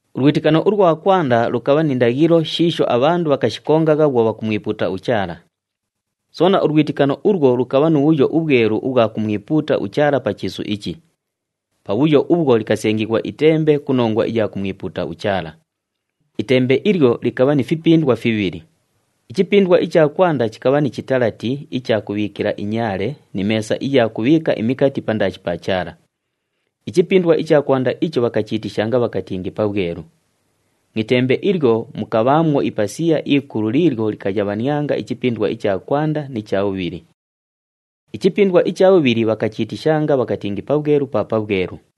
Ulwitikano ulwa kwanda lukabha ni ndaghilo shiisho abhandu bhakashikongagha bhwo bhakumwipuuta uChaala. Soona, ulwitikano ulwo lukabha nu bhuyo ubhwelu ubhwa kumwipuuta uChaala pa chiisu ichi. Pabhuyo ubhwo likasengighwa itembe ku nongwa iya kumwipuuta uChaala. Itembe ilyo likabha ni fipindwa fibhili. Ichipindwa icha kwanda chikabha ni chitalati icha kubhiikila inyaale ni meesa iya kubhiika imikati pandaashi pa Chaala. Ichipindwa icha kwanda icho bhakachiitishanga bhakatingi Pabhwelu. Mu itembe ilyo mukabhaamwo ipasiya ikulu liilyo likayabhanianga ichipindwa icha kwanda ni cha bhubhili. Ichipindwa icha bhubhili bhakachiitishanga bhakatingi Pabhwelu pa Pabhwelu.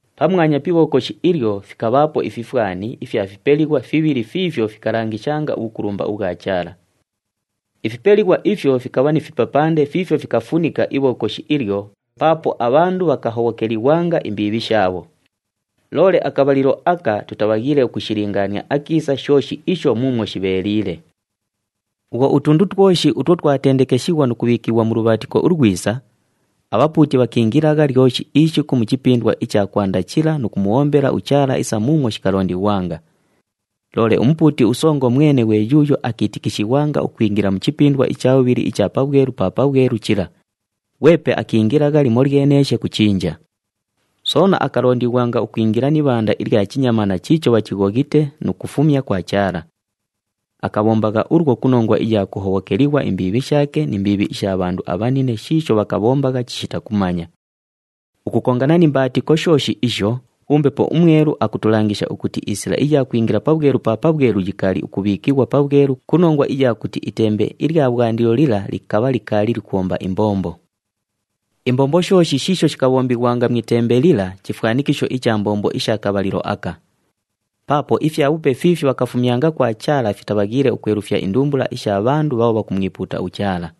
Pamwanya pi Ibhokoshi ilyo fikabhaapo ififwani ifya fipelighwa fibhili fiifyo fikalangishanga ubhukulumba ubhwa Chaala. Ifipelighwa ifyo fikabha ni fipapande fiifyo fikafunika Ibhokoshi ilyo paapo abhandu bhakahobhokelighwanga imbiibhi shaabho. Loole akabhalilo aka tutabhaghiile ukushilingaania akiisa shooshi isho muumwo shibheeliile. Bhwo utundu twoshi utwo twatendekeshighwa nu kubhiikighwa mu lubhaatiko ulwisa, abhapuuti bhakiingilagha lyoshi ishiku mu chipindwa icha kwanda chila nu kumubhombela uChaala isa muumwo shikalondighwanga. Loole umupuuti usongo mwene ghwe yuuyo akiitikishighwanga ukwingila mu chipindwa icha bhubhili icha Pabhwelu pa Pabhwelu chila, ghwepe akiingilagha limolyeneeshe ku chinja. Soona akalondighwanga ukwingila ni ibhanda ilya chinyamaana chiicho bhachighoghite nu kufumya kwa Chaala. Akabhombagha ulwo ku nongwa iya kuhobhokelighwa imbiibhi shaake ni mbiibhi isha bhandu abhanine shiisho bhakabhombagha chishita kumanya. Ukukongana ni mbaatiko shooshi isho, uMbepo uMwelu akutulangisha ukuti isila iya kwingila Pabhwelu pa Pabhwelu yikaali ukubhiikighwa pabhwelu ku nongwa iya kuti itembe ilya bhwandilo lila likabha likaali likubhomba imbombo. Imbombo shooshi shiisho shikabhombighwanga mu itembe lila chifwanikisho icha mbombo isha kabhalilo aka. Paapo ifyabhupe fiifyo bhakufumyanga kwa Chaala fitabhaghiile ukwelufya indumbula isha bhandu bhaabho bhakumwipuuta uChaala.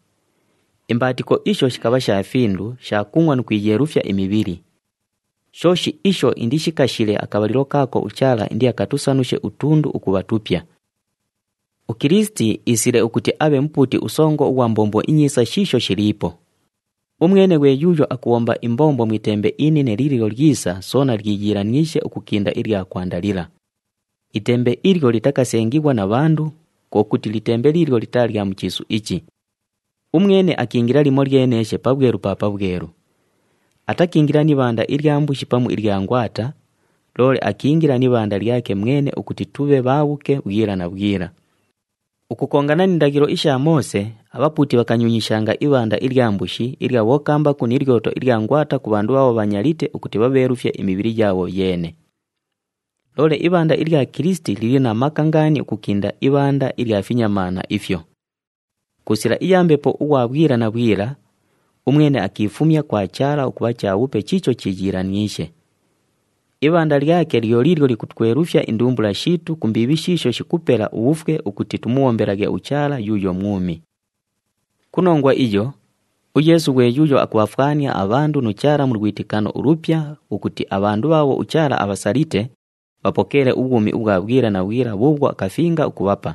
Imbaatiko isho shikabha sha findu, sha kungʼwa nu kwiyeelufya imibhili. Shooshi isho indishikashile akabhalilo kaako uChaala indiakatusanushe utundu ukubha tupya. UKilisiti iisile ukuti abhe Mupuuti uSongo ughwa mbombo inyiisa shiisho shiliipo. Umwene ghwe yuuyo akubhomba imbombo mu itembe inine liilyo lyisa soona lyiyiilaniishe ukukinda ilya kwanda lila. Itembe ilyo litakasengighwa na bhandu, kwo kuti litembe liilyo litaa lya mu chiisu ichi. Umwene akiingila limolyeneeshe Pabhwelu pa Pabhwelu. Atakiingila ni ibhanda ilya mbushi pamu ilya ngwata, loole akiingila ni ibhanda lyake mwene ukuti tubhe bhaabhuke bhwila na bhwila. Ukukongana ni ndaghilo isha Moose, abhapuuti bhakanyunyishanga ibhanda ilya mbushi, ilya bhokambaku ni lyoto ilya ngwata ku bhandu bhaabho bhanyalite ukuti bhabheelufye imibhili yaabho yeene. Loole ibhanda ilya Kilisiti lili na maka ngaani ukukinda ibhanda ilya finyamaana ifyo! Ku sila iya Mbepo ughwa bhwila na bhwila, umwene akiifumya kwa Chaala ukubha chabhupe chiicho chiiyiilaniishe. Ibhanda lyake lyo liilyo likutwelufya indumbula shiitu ku mbiibhi shiisho shikupela ubhufwe ukuti tumubhombelaghe uChaala yuuyo mwumi. Ku nongwa iyo, uYeesu ghwe yuuyo akubhafwania abhandu nu Chaala mu lwitikano ulupya ukuti abhandu bhaabho uChaala abhasalite, bhapokeele ubhwumi ubhwa bhwila na bhwila bhuubhwo akafinga ukubhapa.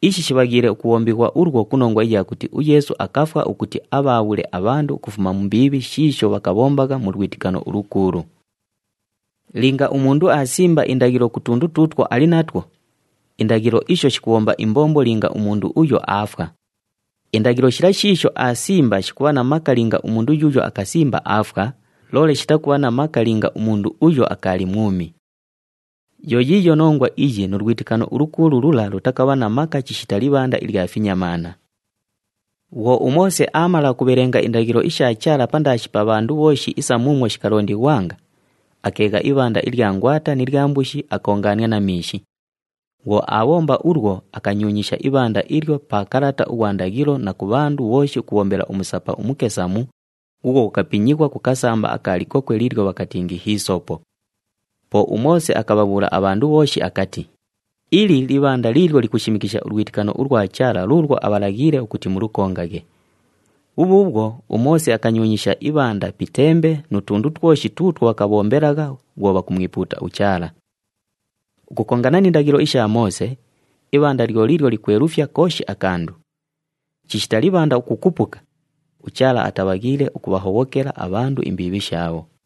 Ishi shibhaghiile ukubhombighwa ulwo ku nongwa iya kuti uYeesu akafwa ukuti abhaabhule abhandu ukufuma mu mbiibhi shiisho bhakabhombagha mu lwitikano ulukuulu. Linga umundu aasimba indaghilo ku tundu tuutwo ali natwo, indaghilo isho shikubhomba imbombo linga umundu uyo aafwa. Indaghilo shila shiisho aasimba shikubha na maka linga umundu yuuyo akasimba aafwa, loole shitakubha na maka linga umundu uyo akaali mwumi. Yo yiiyo nongwa iyi nu lwitikano ulukuulu lula lutakabha na maka chishita libhanda ilya finyamaana. Bhwo uMoose aamala ukubhelenga indaghilo isha Chaala pandaashi pa bhandu bhooshi isa muumwo shikalondighwanga, akeegha ibhanda ilya ngwata ni lya mbushi, akoongaania na miishi. Bhwo aabhomba ulwo, akanyunyisha ibhanda ilyo pa kalata ughwa ndaghilo na ku bhandu bhooshi ukubhombela umusapa umukesamu, ghuughwo ghukapinyighwa ku kasamba aka likokwe liilyo bhakatingi hiisopo. Po uMoose akabhabhuula abhandu bhooshi akati, “Ili libhanda liilyo likushimikisha ulwitikano ulwa Chaala luulwo abhalaghiile ukuti mulukongaghe.” Bhubhuubhwo, uMoose akanyunyisha ibhanda pi itembe nu tundu twoshi tuutwo bhakabhombelagha bhwo bhakumwipuuta uChaala. Ukukongana ni ndaghilo isha Moose, ibhanda lyo liilyo likwelufya kooshi akandu. Chishita libhanda ukukupuka, uChaala atabhaghiile ukubhahobhokela abhandu imbiibhi shaabho.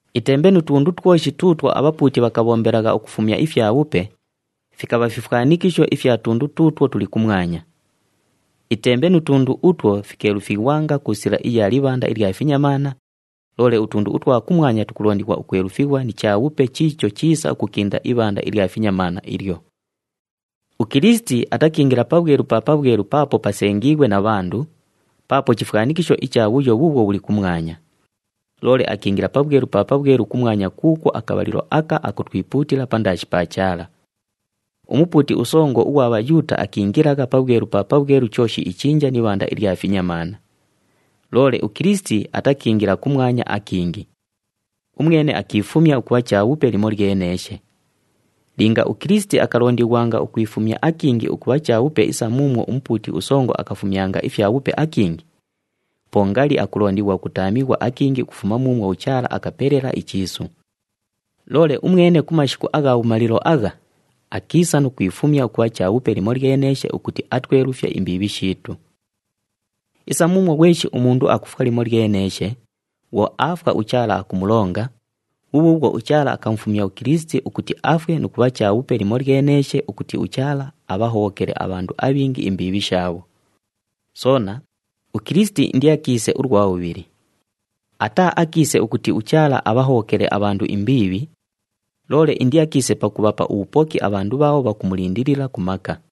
Itembe nu tundu twoshi tuutwo abhapuuti bhakabhombelagha ukufumya ifyabhupe, fikabha fifwanikisho ifya tundu tuutwo tuli kumwanya. Itembe nu tundu utwo fikeelufighwanga ku sila iya libhanda ilya finyamaana, loole utundu utwa kumwanya tukulondighwa ukwelufighwa ni chabhupe chiicho chiisa ukukinda ibhanda ilya finyamaana ilyo. UKilisiti atakiingila Pabhwelu pa Pabhwelu paapo pasengiighwe na bhandu, paapo chifwanikisho icha bhuyo bhuubhwo bhuli kumwanya. Loole akiingila Pabhwelu pa Pabhwelu kumwanya kuukwo akabhalilo aka akutwipuutila pandaashi pa Chaala. Umupuuti usongo ughwa Bhayuuta akiingilagha Pabhwelu pa Pabhwelu chooshi ichinja ni ibhanda ilya finyamaana. Loole uKilisiti atakiingila kumwanya akingi. Umwene akiifumya ukubha chabhupe limolyeneeshe. Linga uKilisiti akalondighwanga ukwifumya akingi ukubha chabhupe isa muumwo umupuuti usongo akafumyanga ifyabhupe akingi, po ngali akulondighwa ukutaamighwa akingi ukufuma muumwo uChaala akapelela ichiisu. Loole umwene ku mashiku agha bhumalilo agha, akiisa nu kwifumya ukubha chabhupe limolyeneeshe ukuti atwelufye imbiibhi shiitu. Isa muumwo ghweshi umundu akufwa limolyeneeshe, bhwo aafwa, uChaala akumulonga, bhubhuubhwo uChaala akamufumya uKilisiti ukuti afwe nu kubha chabhupe limolyeneeshe ukuti uChaala abhahobhokele abhandu abhingi imbiibhi shaabho. Soona, uKilisiti indiakiise ulwa bhubhili. Ataaakiise ukuti uChaala abhahobhokele abhandu imbiibhi, loole indiakiise pakubhapa ubhupoki abhandu bhaabho bhakumulindilila ku maka.